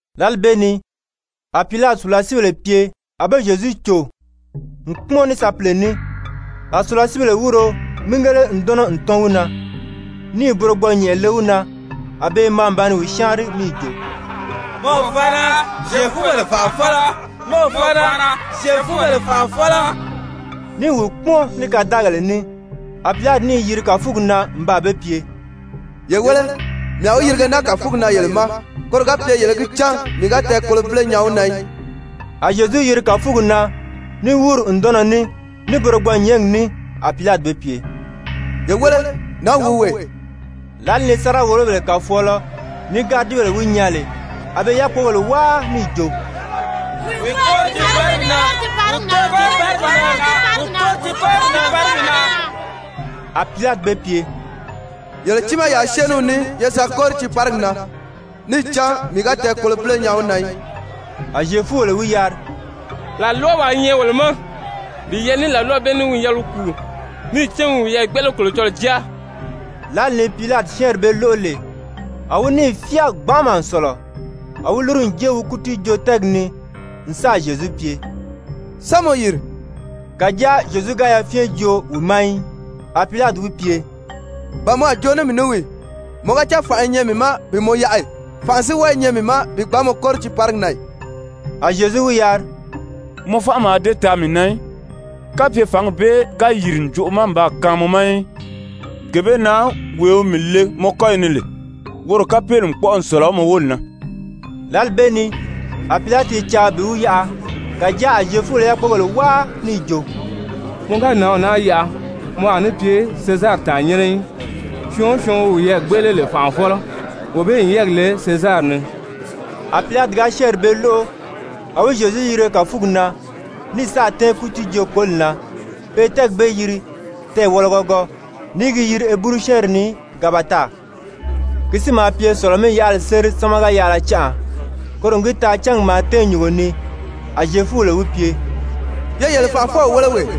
Lǎli bee ni a Pilati sùlasiibèle pye a be Zyezu cò n kpúmɔn ní sapile ní. A sùlasiibèle wúuro mígele ǹdɔnnɔ n tɔ́n wi na, níì burogbɔɔ-nyɛ̀nʔɛ le wi na. A be i maa n ba ni wi syáanri níì jo: «Mɔ o faana, mɔ Zyefubèle fànʔafɔlɔ!» Ní i wi kpúmɔn ní kadaagèle ní. A Pilati níì yiri kàfugi na n baa be pye: «Ye wéle, mii a wi yirige naa kàfugi na yele ma, koro ga pye yele í gi cán mii ga tɛɛkolobile nyaa wi na í.» A Zyezu yiri kàfugi na ní wúuri ǹdɔnnɔ ní, ní burogbɔɔ-nyɛ̀ɛ́ngi ní. A Pilati be pye: «Ye wéle, nǎnw wi wee!» Lǎli ni sáriga-wòlobèle kàfɔɔlɔ ní gáridibèle wi nyaa lè, a be i yákpogèle wáa níì jo: «Wi kóri tiiparigi na! Wi kóri tiiparigi na!» A Pilati be pye: «Yele tiimaa yaa syée ní wi ní ye sa kóri tiiparigi na! Níì cán mii ga tɛɛkolobile nyaa wi na í.» A Zyefubèle wi yari: «Làlwawaa i nyɛ wolo ma, bi yɛlɛ ní làlwaw bee ní wi n yɛlɛ wi kùu, níì cán wi n wiyɛɛ gbéʔele Kolocɔlɔɔ Jáa.» Lǎli ni Pilati syɛ́ɛnri bee lóʔo lè, a wi níì fyáa gbanʔama n sɔ̀lɔ. A wi lúru n jée wi kútiijoo-tɛ́ɛgi ni n sáà Zyezu pye: «Sán mɔ yìri?» Kàjáa Zyezu ga yafyɛn joo wi ma í. A Pilati wi pye: «Ba mɔ a joo ní mii ní wii ì? Mɔ ga cán fànʔa i nyɛ mii ma bi mɔ yaʔa ì? Fànʔa si wɔ́ɔ i nyɛ mii ma bi gbǎn mɔ kóri tiiparigi na ì?» A Zyezu wi yari: «Mɔ fánʔa mǎà dée taa mii na í, kapye fǎngi bee ga yìri ǹjoʔo ma n baa kaan mɔ ma í. Gee bee na wee wi mii le mɔ kɔ́yi ni lè, woro kapeeli n kpɔ́ʔɔ n sɔ̀lɔ mɔ wóli na.» Lǎli bee ni a Pilati i caa bi wi yaʔa, kàjáa a Zyefubèle i yákpogèle wáa níì jo: «Mɔ ga nǎnw naa yaʔa, mɔ a ní pye Sezari tàannyɛnnɛ í. Syɔɔn o syɔɔn wi wiyɛɛ gbéʔele lè fànʔafɔlɔ, wee bee n yɛ́ɛgi le Sezari ni.» A Pilati ga syɛ́ɛnri bee lóʔo, a wi Zyezu yirige kàfugi na, ní sáà tɛ́ɛn kútiijoo-koli na, pe i tɛ́ɛgi bee yiri Tɛɛwɔlɔgɔgɔ, ní i gi yiri Heburu-syɛ́ɛnri ni Gabata. Ki si maa pye Sɔ̀lɔ-mí-yaʔali séri sámaga-yaʔala canʔa, koro n gi taa cángi maa tɛ́ɛn nyùngo ni. A wi Zyefubèle pye: «Ye yele fànʔafɔw wéle wee.»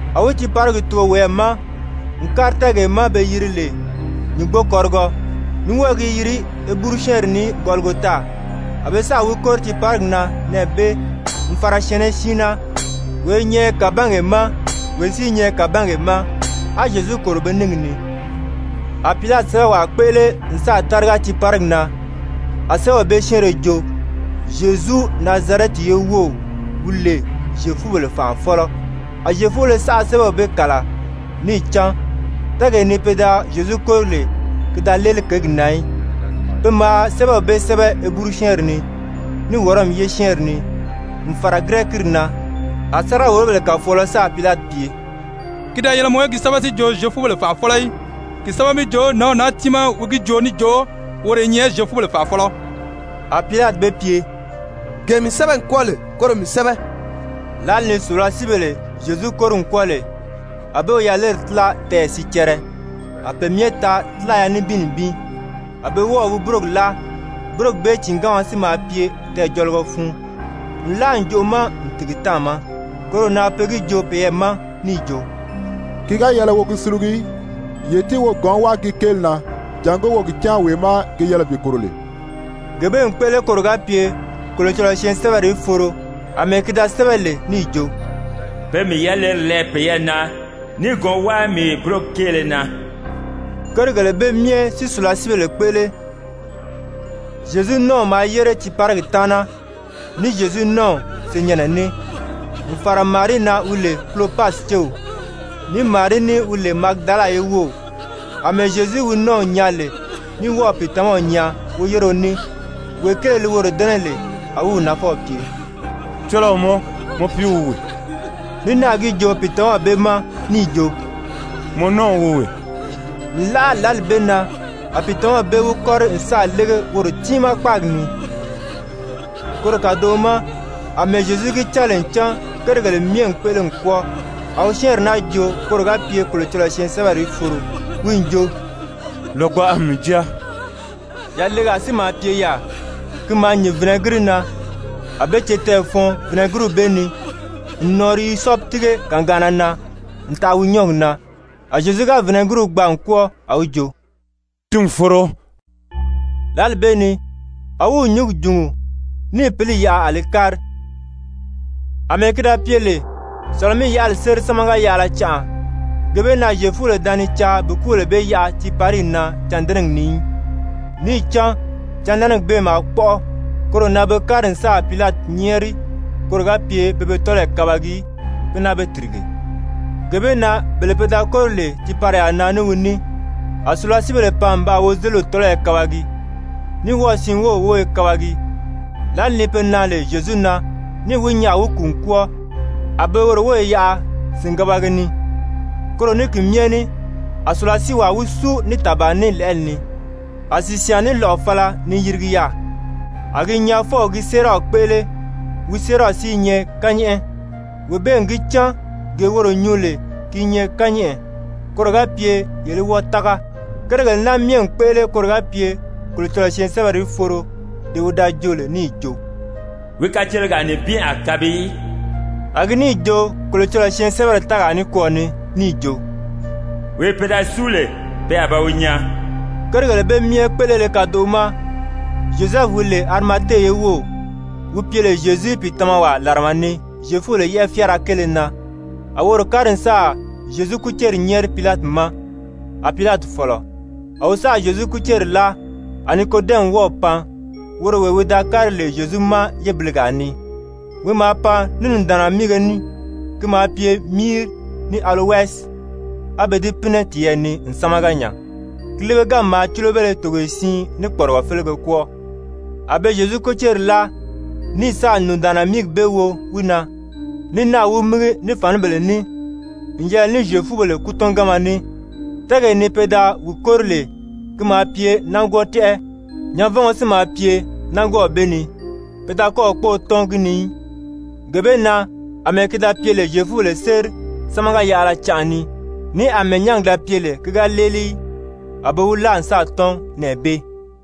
A wi tiiparigi tugo wiyɛɛ ma n kári tɛ́ɛgee ma be yiri lè Nyùngbokɔrigɔ, ní wɔ́ɔ i gi yiri Heburu-syɛ́ɛnri ni Gɔligota. A be sáà wi kóri tiiparigi na nɛɛ bee n fàra syɛ̀ɛnnɛ siin na, wee i nyɛ kàbangee ma, wee si i nyɛ kàbangee ma, á Zyezu kòro be níngi ni. A Pilati sɛ́bɛwaa kpéʔele n sáà táriga tiiparigi na, a sɛ́bɛw bee syɛ́ɛnrɛ jo: ZYEZU, NAZARƐTI YE WOW, WI LE ZYEFUBELE FANʔAFƆLƆ. A Zyefubéle saʔa sɛ́bɛw bee kàla, níì cán tɛ́ɛgee ni pe da Zyezu kóri lè, ki da léeli kěgi na í. Pe maa sɛ́bɛw bee sɛ́bɛ Heburu-syɛ́ɛnri ni, ní Wɔrɔmi ye syɛ́ɛnri ni, n fàra Girɛkiiri na. A sáriga-wòlobèle kàfɔɔlɔ sáà Pilati pye: «Ki da yɛlɛ mɔ í gi sɛ́bɛ si jo Zyefubèle fànʔafɔlɔ í. Ki sɛ́bɛ mi jo, nǎnw naa tiimaa wi gi joo níì jo woro wi nyɛ Zyefubèle fànʔafɔlɔ.» A Pilati be pye: «Gee mii sɛ́bɛ n kwɔ́ɔ lè, koro mii sɛ́bɛ.» Lǎli ni sùlasiibèle Zyezu kóri n kwɔ́ɔ lè, a be wi yaleri tíla tɛɛyɛ sicɛrɛ, a pe myɛ taa tílaya nibin nibin. A be wɔ́ɔ̀ wi búrogi láa. Búrogi bee tìinganma si maa pye tɛɛjɔligɔ fun nlaa ǹjoʔo ma n tìgi táàma. Koro na pe gi joo peyɛɛ ma níì jo: «Ki ga yɛlɛ wo gi sulugu í. Ye tíi wo gɔ̌n wáa gi kéeli na, jàngó wo gi cán wee má gi yɛlɛ bi kòro lè.» Gee bee n kpéʔele koro ga pye Kolocɔlɔɔ syɛɛnsɛbɛri í foro àmɛɛ ki da sɛ́bɛ lè níì jo: «Pe n mii yaleri lɛɛ peyɛɛ na níì gɔ̌n wáa mii búrogi kéele na.» Kérigèle bee myɛ si sùlasiibèle kpéʔele. Zyezu nɔ́ɔw maa yére tiiparigi taana ní Zyezu nɔ́ɔw senyɛnnɛ ní, n fàra Marii na wi lè Kulopasi céw, ní Marii ní wi lè Magidala ye wów. Amɛɛ Zyezu wi nɔ́ɔw nyaa lè ní wɔ́ɔ̀ pìitamaw nyaa woyéreo ní, wee kéele li woro dɛ́nɛ lè, a wi wi nafɔw pye: «Cɔlɔɔ mɔ, mɔ piiw wi wee.» Ní náà gi joo pìitamaw bee ma níì jo: «Mɔ nɔ́ɔw wi wee.» Nlaʔa lǎli bee na a pìitamaw bee wi kɔ́ri n sáà lége woro tiimaa kpáagi ni. Koro kàdoʔo ma àmɛɛ Zyezu gi cán lè ncan kérigèle myɛ n kpéʔele n kwɔ́ɔ, a wi syɛ́ɛnri naa joo koro ga pye Kolocɔlɔɔ syɛɛnsɛbɛri í foro, wi n jo: «Lògbaʔa n mii jáa.» Yalegaa si maa pye yaà, ki maa nyìn vinɛgiri na. A be cétɛɛ fɔɔn vinɛgiriw bee ni n nɔɔri hizɔpi tíige kagaanna na n taʔa wi nyɔ́ɔgi na. A Zyezu ga vinɛgiriw gbaa n kwɔ́ɔ, a wi jo: «Ti n foro.» Lǎli bee ni a wi nyǔngi jùngu níì pǐli yaʔa a li kári. Amɛɛ ki da pye lè Sɔ̀lɔ-mí-yaʔali séri sámaga-yaʔala canʔa, gee bee na Zyefubèle da ni caa bi kúbèle bee yaʔa tiipariyi na cândɛnɛgi ni í, níì cán cândɛnɛgi bee maa kpɔ́ʔɔ. Koro na be kári n sáà Pilati nyɛ́ɛri koro ga pye pe be tɔ́lɔyi kabagi si naa be tìrige. Gee bee na bele pe da kóri lè tiipariyaa na ní wi ní, a sùlasiibèle pan n baa wozeliw tɔ́lɔyɔ kabagi, ní wɔ́ɔ̀ siin wów wóyo kabagi. Lǎli ni be nan lè Zyezu na níì wi nyaa a wi kùu n kwɔ́ɔ, a be woro wóyi yaʔa sìngabagi ni. Koro ní ki myɛ ní a sùlasiiwaa wi súu ní tàbaa ní lɛ̀ʔɛli ni, a sìsyaan ní lɔ̀ʔɔ fala ni yirigi yaà. A gi nyaafɔw gi séeraw kpéʔele, wi séeraw si i nyɛ kányɛʔɛ. Wee bee n gi cán gee woro nyuu lè ki i nyɛ kányɛʔɛ, koro ga pye yele í wɔ́ɔ tága. Kérigèle naa myɛ n kpéʔele koro ga pye Kolocɔlɔɔ syɛɛnsɛbɛri í foro dee wi da joo lè níì jo: «Wi kacelegaa nibin a kabi í.» A gi níì joo Kolocɔlɔɔ syɛɛnsɛbɛri tɛ́ɛgaa nikwɔɔ ni níì jo: «Wee pe da súu lè, pe a ba wi nyaa.» Kérigèle bee myɛ kpéʔelele kadoʔo ma Zyozɛfu wi lè Arimate ye wów, wi pye lè Zyezu pìitamawaa làrama ni Zyefubèle yɛ́ʔɛ fyáara kéele na, a woro kári n sáà Zyezu kúceri nyɛ́ɛri Pilati ma. A Pilati fɔ̀lɔ. A wi sáà Zyezu kúceri láa. A Nikodɛmi wɔ́ɔ̀ pan, woro wee wi da kári lè Zyezu ma yébiligaa ni, wi maa pan ní nùndaanna míige ní, ki maa pye míiri ní alowɛsi, a be di pínɛ tiyɛɛ ni n sámaga nya, ki líbeganmi maa cúlobéle togoye siin ní kpɔrigɔ félege kwɔ́ɔ. A be Zyezu kúceri láa, ní sáà nùndaanna míigi bee wo wi na, ní náà wi mígi ní fànibèle ní n yɛlɛ ní Zyefubèle kútɔnganma ní. Tɛ́ɛgee ni pe da wi kóri lè, ki maa pye nángwɔɔ tɛ́ʔɛ, nyanvɔngɔ si maa pye nángwɔɔw bee ni, pe da kɔ́ɔ̀ kpóō tɔ́n gi ni í. Gee bee na àmɛɛ ki da pye lè Zyefubèle séri sámaga-yaʔala canʔa ni, ní àmɛɛ nyángi da pye lè ki ga léeli í, a be wi láa n sáà tɔ́n nɛɛ bee.